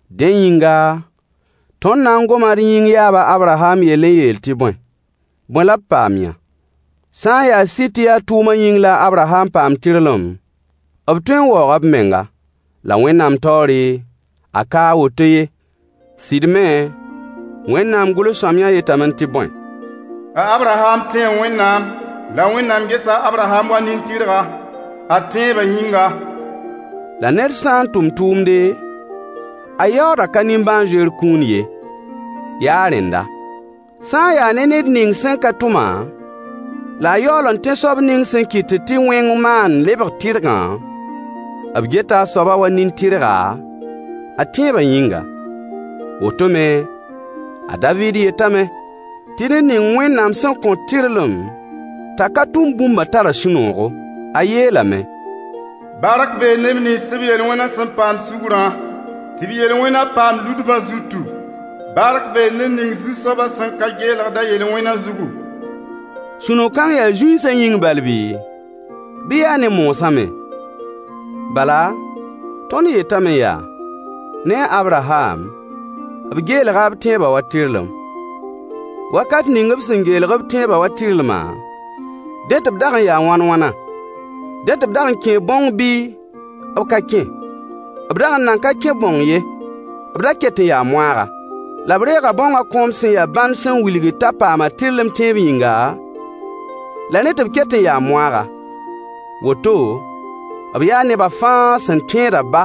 Dẽ yĩnga, tõnd na n goma d yĩng yaab a Abraham yell n yeel tɩ bõe? Bõe la b paam-yã? Sã n yaa sɩd tɩ yaa tʋʋmã yĩng la a Abraham paam tɩrlem, b tõe n waooga b menga. La Wẽnnaam taoore, a ka a woto ye. Sɩd me, Wẽnnaam gʋls-sõamyã yetame tɩ bõe? A Abraham tẽe Wẽnnaam, la Wẽnnaam gesa a Abraham wa nin-tɩrga, a tẽebã yĩnga. La ned sã n tʋm tʋʋmde, a yaoodã ka nimbãan-zoeer kũun ye, yaa a rẽnda. Sã n yaa ne ned ning sẽn ka tʋm-a, la a yaool n tẽ soab ning sẽn kɩtd tɩ wẽng maand lebg tɩrgã, b geta a soabã wa nin-tɩrga a tẽebã yĩnga. Woto me, a Daviid yetame tɩ ned ning Wẽnnaam sẽn kõt tɩrlem t'a ka tʋm bũmbã tara sũ-noogo. A yeelame: Bark bee neb nins b yel-wẽnã sẽn paam sugrã, tɩ b yel-wẽnã paam ludbã zutu. Bark bee ned ning Zu-soabã sẽn ka geelgd a yel-wẽnã zugu. Sũ-no-kãng yaa zũinsã yĩng bal bii, bɩ yaa ne moosã me? Bala, tõnd yetame yaa: Ne a Abraham, b geelga b tẽebã wa tɩrlem. Wakat ning b sẽn geelg b tẽebã wa tɩrlma, dẽ tɩ b dag n yaa wãn-wãna? Dẽ tɩ b dag n kẽe bãong bɩ b ka kẽ? B dag n nan ka kẽ bãong ye, b da ket n yaa moaaga. La b reega bãongã kõom sẽn ya bãnd sẽn wilg t'a paama tɩrlem tẽeb yĩnga, la rẽ tɩ b ket n yaa moaaga. Woto, b yaa nebã fãa sẽn tẽedã ba,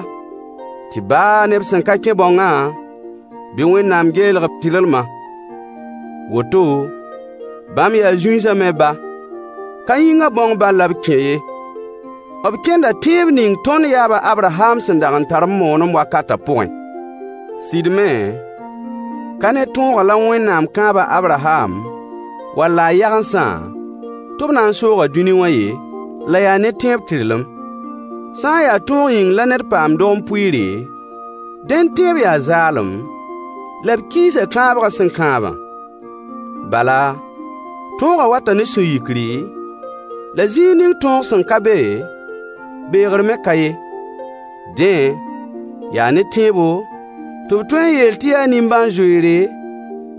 tɩ baa ne b sẽn ka kẽ bãongã, bɩ Wẽnnaam geelg-b tɩrlmã. Woto bãmb yaa zũinsã me ba. Ka yĩngã bãong bal la b kẽ ye, b kẽnda tẽeb ning tõnd yaab a Abraham sẽn dag n tar b moonem wakatã pʋgẽ. Sɩd me, ka ne tõogã la Wẽnnaam kãab a Abraham wall a yagensã tɩ b na n sooga dũni wã ye, la yaa ne tẽeb tɩrlem. Sã n yaa tõog yĩng la ned paamd dogem-pʋɩɩre, dẽnd tẽeb yaa zaalem, la b kiisa kãabgã sẽn kãabã. Bala, tõogã wata ne sũ-yikri, la zĩig ning tõog sẽn ka be, beegr me ka ye. Dẽ, yaa ne tẽebo, tɩ b tõe n yeel tɩ yaa nimbãan-zoeere,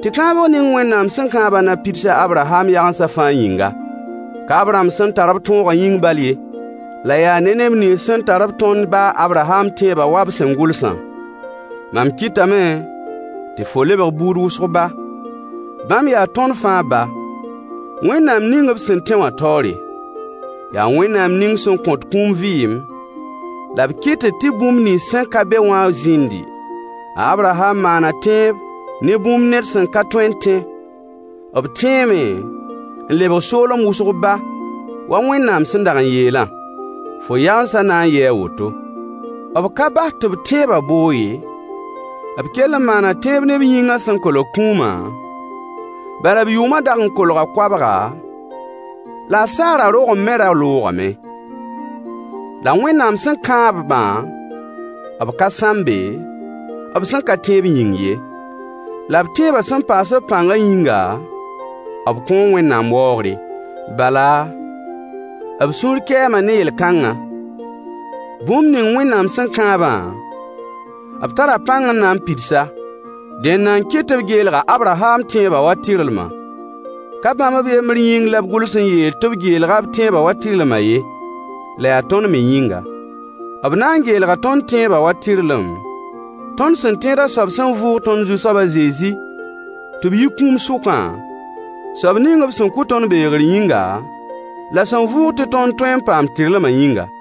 tɩ kãabg ning Wẽnnaam sẽn kãabã na pids a Abraham yagensã fãa yĩnga. Ka b rãmb sẽn tar-b tõogã yĩng bal ye, la yaa ne neb nins sẽn tar-b tõnd ba a Abraham tẽebã wa b sẽn gʋlsã: Mam kɩtame tɩ fo lebg buud wʋsg ba. Bãmb yaa tõnd fãa ba, Wẽnnaam ning b sẽn tẽ wã taoore. Yaa Wẽnnaam ning sẽn kõt kũum vɩɩm, la b kɩtd tɩ bũmb nins sẽn ka be wã zĩndi. A Abraham maana tẽeb ne bũmb ned sẽn ka tõe n tẽ, b tẽeme n lebg soolem wʋsg ba wa Wẽnnaam sẽn dag n yeelã: Fo yagensã na n yɩɩ a woto. B ka bas tɩ b tẽebã boog ye, b kell n maana tẽeb ne b yĩngã sẽn kolg kũumã, bal b yʋʋmã dag n kolga koabga, la a Sara rogem me ra loogame. La Wẽnnaam sẽn kãab-bã, b ka sãmbe, b sẽn ka tẽeb yĩng ye. La b tẽebã sẽn paas-b pãngã yĩnga, b kõo Wẽnnaam waoogre. Bala, b sũur kɛɛma ne yel-kãngã: Bũmb ning Wẽnnaam sẽn kãabã, b tara pãng n na n pids-a. Dẽnda n kɩt tɩ b geelg a Abraham tẽebã wa tɩrlmã. Ka bãmb b yembr yĩng la b gʋls n yeel tɩ b geelga b tẽebã wa tɩrlmã ye, la yaa tõnd me yĩnga. B na n geelga tõnd tẽebã wa tɩrlem, tõnd sẽn tẽed a soab sẽn vʋʋg tõnd Zu-soab a Zezi tɩ b yi kũum sʋkã, soab ning b sẽn kʋ tõnd beegr yĩnga, la sẽn vʋʋg tɩ tõnd tõe n paam tɩrlmã yĩnga.